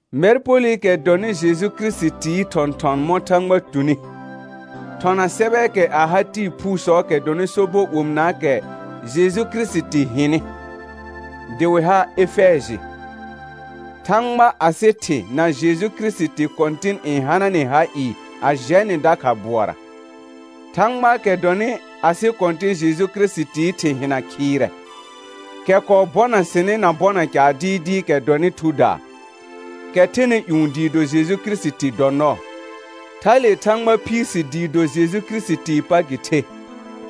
Mɛr Polɩkɛ dɔnɩ Jeju Kirisitii thɔ̃thɔn mɔ̃ Thãgba tuni, thɔna sɛbɛɛkɛ a ha tɩɩ phuusɔɔkɛ dɔnɩ sobɔ omɩnaakɛ Jeju Kirisiti hɩnɩ, dɩ wɩ ha Efɛjɩ. Thãgba asɩ Thɩ na Jeju Kirisiti Kɔ̃tɩn n hana nɩ ha ɩɩ a jɛ nɩ dakha bʋɔra. Thãgbaakɛ dɔnɩ asɩ Kɔ̃tɩ̃ Jeju Kirisitii Thɩ hɩna khɩɩrɛ, kɛ kɔɔ bɔna sɩnɩ na bɔna caar dɩɩdɩɩkɛ dɔnɩ thudaa, kɛ thɛnɩ ƴũ dɩɩ do Jeju Kirisiti dɔ nɔɔ. Thale Thãgba phiir si dɩɩ do Jeju Kirisitii pa gɩ the,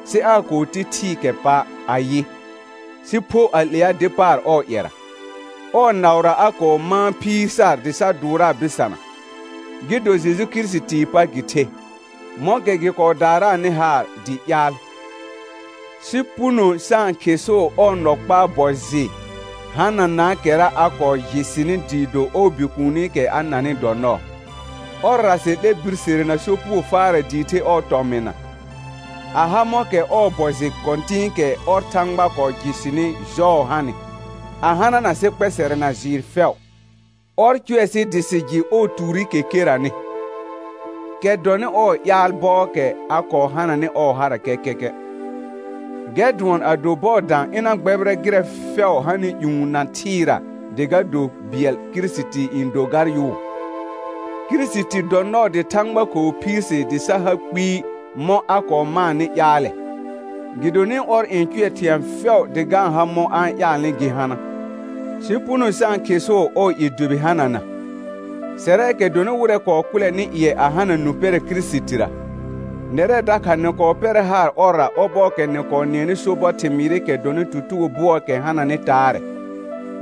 sɩ aa kɔɔ ti thɩɩkɛ pa' ayɩ, sɩ pho a 'lea dɩ paar ɔɔ ƴɛra. Ɔɔ naʋra a kɔɔ mãa phiir sar dɩ sa dʋʋraa bɩsana, gɩ do Jeju Kirisitii pa gɩ the, mɔ̃kɛ gɩ kɔɔ daaraanɩ haar dɩ ƴaal, sɩ puno sa-n khɩsʋʋ ɔɔ nɔ kpaa bɔ jɩ hananaakɛra a kɔɔ jɩ sɩnɩ dɩɩ do ɔɔ Bikuunikɛ a nanɩ dɔ nɔɔ. Ɔrra sɩ 'lɛ birsere na sopugo faarɛ dɩɩ the ɔɔ tɔmɩna, a ha mɔ̃kɛ ɔɔ bɔ jɩ kɔ̃tɩ̃ɩkɛ ɔr Thãgba kɔɔ jɩ sɩnɩ jɔɔ hanɩ, a hanana sɩ kpɛsɛrɛ na jɩɩr fɛʋ. Ɔr cʋɛ sɩ dɩ sɩ jɩ ɔɔ tuurikɛ keranɩ, kɛ dɔnɩ ɔɔ ƴaal bɔɔkɛ a kɔɔ hananɩ ɔɔ hara kɛkɛkɛ, gɛr dʋɔn ado bɔɔ dã ɩna gbɛbɩrɛ gɩrɛ fɛʋ hanɩ ƴũ na thɩɩra dɩ ga do bɩɛl Kirisiti n do gar yʋʋ. Kirisiti dɔ nɔɔ dɩ Thãgba kɔɔ phiir si dɩ sa ha kpɩɩ mɔ̃ a kɔɔ maanɩ ƴaalɛ, gɩdonɩ ɔr n cʋɛ thɩ̃ɛ fɛʋ dɩ ga-n ha mɔ̃ a-n ƴaalnɩ gɩ hana, sɩ puno sa-n khɩsʋʋ ɔɔ i dʋbɩ hanana, sɛrɛɛkɛ dɔnɩ wɩrɛ kɔɔ kʋlɛnɩ ƴɩɛ a hana nũ pɛrɛ Kirisitira. Nɛrɛ dakha nɩ kɔɔ pɛrɛ haar ɔrra ɔbɔɔkɛ nɩ kɔɔ nɩɛnɩ sobɔ thɩmɩɩrɩkɛ dɔnɩ tutugo bʋɔɔkɛ hananɩ taarɛ,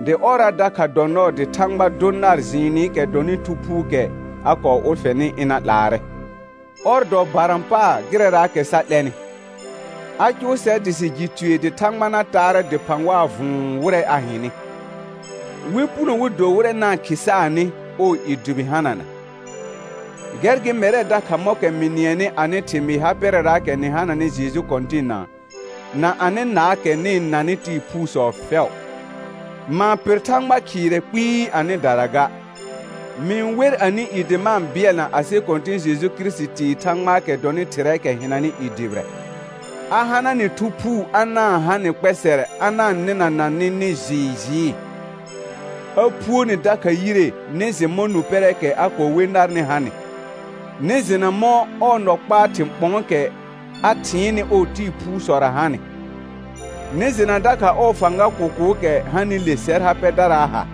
dɩ ɔrra dakha dɔ nɔɔ dɩ Thãgba dʋ nar jɩɩnɩkɛ dɔnɩ Thu Phuukɛ a kɔɔ ʋlfɛnɩ ɩna ' laarɛ, ɔr dɔ barã paar gɩrɛraakɛ sa 'lɛnɩ, a cʋʋ sɛr dɩ sɩ jɩ tue dɩ Thãgba na taarɛ dɩphã waa vʋ̃ʋ wɩrɛ a hɩnɩ, wɩ puno wɩ do wɩrɛ na-n khɩsaanɩ ɔɔ i dʋbɩ hanana. Gɛr gɩ mɛrɛ dakha mɔ̃kɛ mɩ nɩɛnɩ anɩ thɩmɩɩ ha pɛrɛraakɛ nɩ hananɩ Jeju Kɔ̃tɩnna, na anɩ naakɛ nɩ-n nanɩ tɩɩ phuusɔ fɛʋ. Ma-n pɩr Thãgba khɩɩrɛ kpɩɩ anɩdara ga. Mɩ-n wer anɩ i dɩ ma-n bɩɛlna asɩ Kɔ̃tɩ̃ Jeju Kirisitii Thãgbaakɛ dɔnɩ Thɩrɛɛkɛ hɩnanɩ i dʋbɩrɛ, a hana nɩ Thu Phuu a na-n ha nɩ kpɛsɛrɛ a na-n nɩnana nɩ nɩ jɩɩ jɩɩ; a phuo ni dakha yire nɩ jɩ mɔ̃ nũ pɛrɛɛkɛ a kɔɔ we narnɩ hanɩ, nɩ jɩna mɔ̃ ɔɔ nɔ kpaa thɩ̃ ɓɔ̃ɔkɛ a thɩɩnnɩ ɔɔ tɩɩ phusɔra hanɩ, nɩ jɩna dakha ɔɔ fãga kʋkʋʋkɛ hanɩle sɛr ha pɛdaraa ha,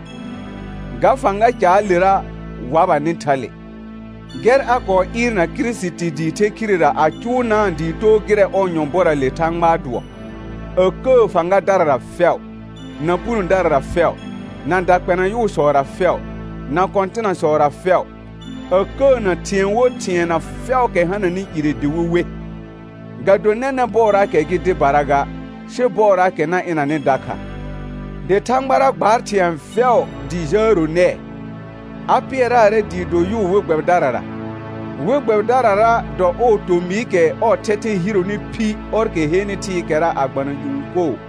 ga fãga caalera wabanɩ thale; gɛr a kɔɔ ɩɩrna Kirisiti dɩ the khirera a cʋʋnaa dɩ too gɩrɛ ɔɔ nyɔ̃bɔra le Thãgbaa dʋɔ, a kəə fãgadarara fɛʋ, na punodarara fɛʋ, na dakpɛna yʋʋsɔra fɛʋ, na kɔ̃tɩnasɔra fɛʋ, a kəəna thɩ̃ɛ wo thɩɛna fɛʋʋkɛ hananɩ ire dɩ wɩ we, ga do nɛnɛ̃ bɔɔraakɛ gɩ dɩbara ga, sɩ bɔɔraakɛ na ɩnanɩ dakha. Dɩ Thãgbara gbaar thɩ̃ɛ fɛʋ dɩ jəəro nɛɛ, a pɩɛraarɛ dɩ do yʋʋ we gbɛbɩdarara. We gbɛbɩdarara dɔ ɔɔ tomɩɩkɛ ɔɔ thɛthɛ hironi phi ɔrkɛ henɩ thɩɩkɛra a gbana ƴũ koo.